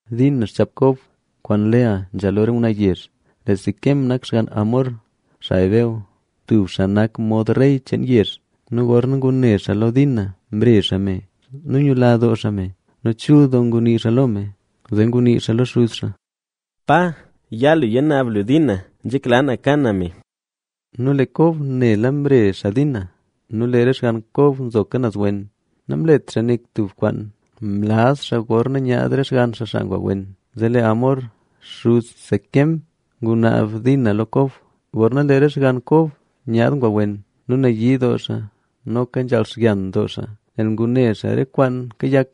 Dina xchaap Kob kwaan Lea nzha lo re ngwnaa yezh. Lee Siquem nak xgann Hamor, xaa Heveo, tub xaa nak mod rey cheen yezh. Nu gorna ngune xaa lo Dina mre xaa me. Nu yula doo xaa me nu chul doo ngunii xaa lo me. Zee ngunii xaa lo xuz xaa: —Pa, ya lu yanaab lu Dina. Nzhekla na ka na me. Nu lee Kob nela mre xaa Dina. Nu lee re xgann Kob nzoka naz wen, namlet xaa nik tub kwaan, mlaz xaa gorna nyaad re xgann xaa xaa ngwa wen. Zee lee Hamor, xuz Siquem, ngunaab Dina lo Kob. Gorna lee re xgann Kob nyaad ngwa wen nu nayii doo xaa noka nzhaal xyan doo xaa nel ngune xaa re kwaan kayak.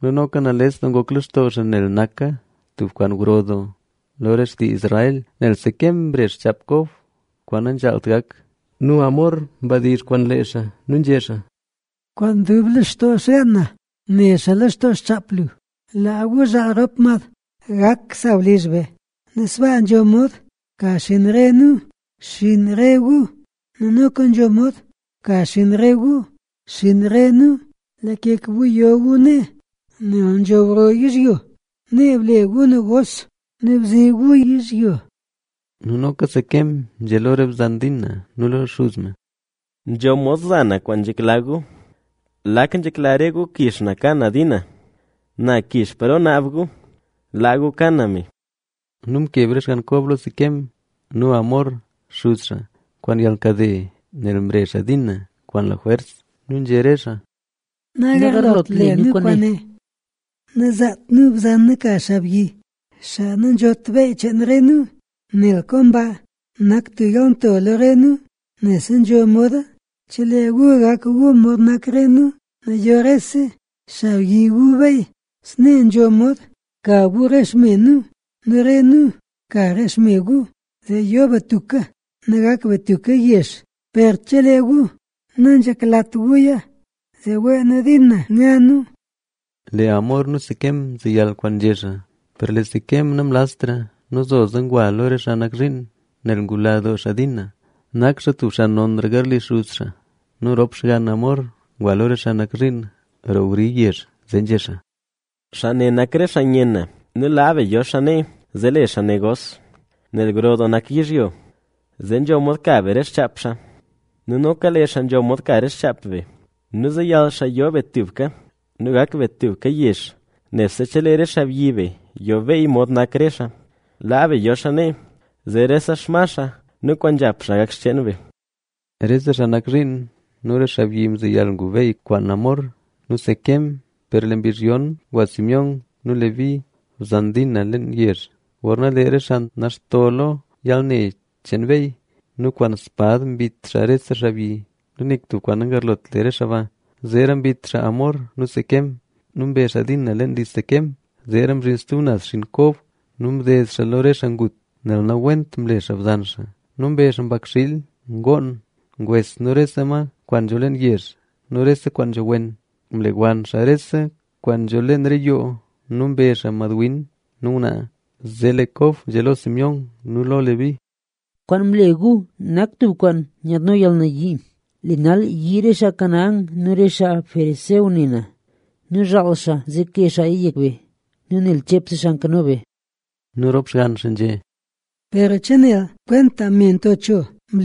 Nu noka nales ngok lextoo xaa nel naka tub kwaan gro doo lo re xtii Israel, nel Siquem mre xchaap Kob kwaan nanzhaalt gak. Nu Hamor mdizh kwaan lee xaa nu nzhé xaa: —Kwaan dub lextoo xgaan na ne xaa lextoo xchaap lu. Laa gu zhaal rop mad. Gak sawlizh be nu sbaa nzho mod ka xinn re nu xinn re gu nu noka nzho mod ka xinn re gu xinn re nu. Blakeka gu yo gu nee nel nzho gro yizhyo. Nee ble gu negos nu bzi gu yizhyo. Nu noka Siquem nzhé lo re bzan Dina nu lo xuz me: —Nzho mod za na kwaan nzhekla gu. ¿Lak nzhekla re gu kix na ka na Dina? Na kix paro naab gu. ¡Laa gu ka na me! Nu mkeb re xgann Kob lo Siquem nu Hamor, xuz xaa, kwaan yalkade, nel mre xaa Dina kwaan lajwers. Nu nzhé re xaa: —Nagarlot le nu kwaane, nazaat nu bzan nu ka xaabyi, xaa nanzhot beey cheen re nu, nel komba nak tub yalnto lo re nu. Nebse nzho moda chelee gu gak gu mod nak re nu nu yo rese xaabyi gu beey. Snee nzho mod ka gu re xme nu nu re nu ka re xme gu, zee yo be tubka nu gak be tubka yezh. Per chelee gu nanzheklat guya, zee wee nu Dina nya nu. Lee Hamor nu Siquem mzeyal le kwaan nzhé xaa. Per lee Siquem namlaztra nu zoza ngwa xaa lo re xaa nak zhiin, nel ngula doo xaa Dina. Nak xaa tub xaa nonra garli xuz xaa. Nu rop xgann Hamor ngwa lo re xaa nak zhiin roo wri yezh, zee nzhé xaa: —Xaa ne nak re xaa nyen na nu laa be yo xaa nee, zee le xaa negos, nel gro doo nak yizhyo. Zee nzho mod ka be re xchaap xaa nu noka lee xaa nzho mod ka re xchaap be. Nu zeyal xaa yo be tubka nu gak be tubka yezh, nebse chelee re xaabyi be yo beey mod nak re xaa. Laa be yo xaa nee, zee rese xma xaa nu kwaan nzhap xaa gak xcheen be. Rese xaa nak zhiin nu re xaabyi mzeyal gu beey kwaan Hamor nu Siquem. Per lee mbizh yon ngwa Simeón nu Leví, bzan Dina leen yezh, gorna lee re xaa naxto lo yalne cheen beey. Nu kwaan spad mbit xaa rese xaabyi. Nu nik tub kwaan nagarlot le re xaa ba. Zeera mbit xaa Hamor nu Siquem nu mbe xaa Dina leen li Siquem. Zeera mzhin stub naz xinn Kob nu mded xaa lo re xaa ngut, nel nawent mle xaa bzan xaa. Nu mbe xaa mbakxiil, ngoon, ngwes nu rese kwaan nzho leen yezh nu rese kwaan nzho wen. Mlewann xaa rese kwaan nzho leen re yoo nu mbe xaa madwin nu ngwnaa. Zee lee Kob nzhé lo Simeón nu lo Leví: —¡Kwaan mle gu nak tub kwaan nyaadno yalnayii! Lee nal yii re xaa Canaán nu re xaa Ferezeo ne na. Nu zhaal re xaa, zee kee xaaya yek be nu nel cheepse xaa nkano be. Nu rop xgann xaa nzhé: — ¿Nanzhaalt ngle xaa bzan nu mod tub me nto cho?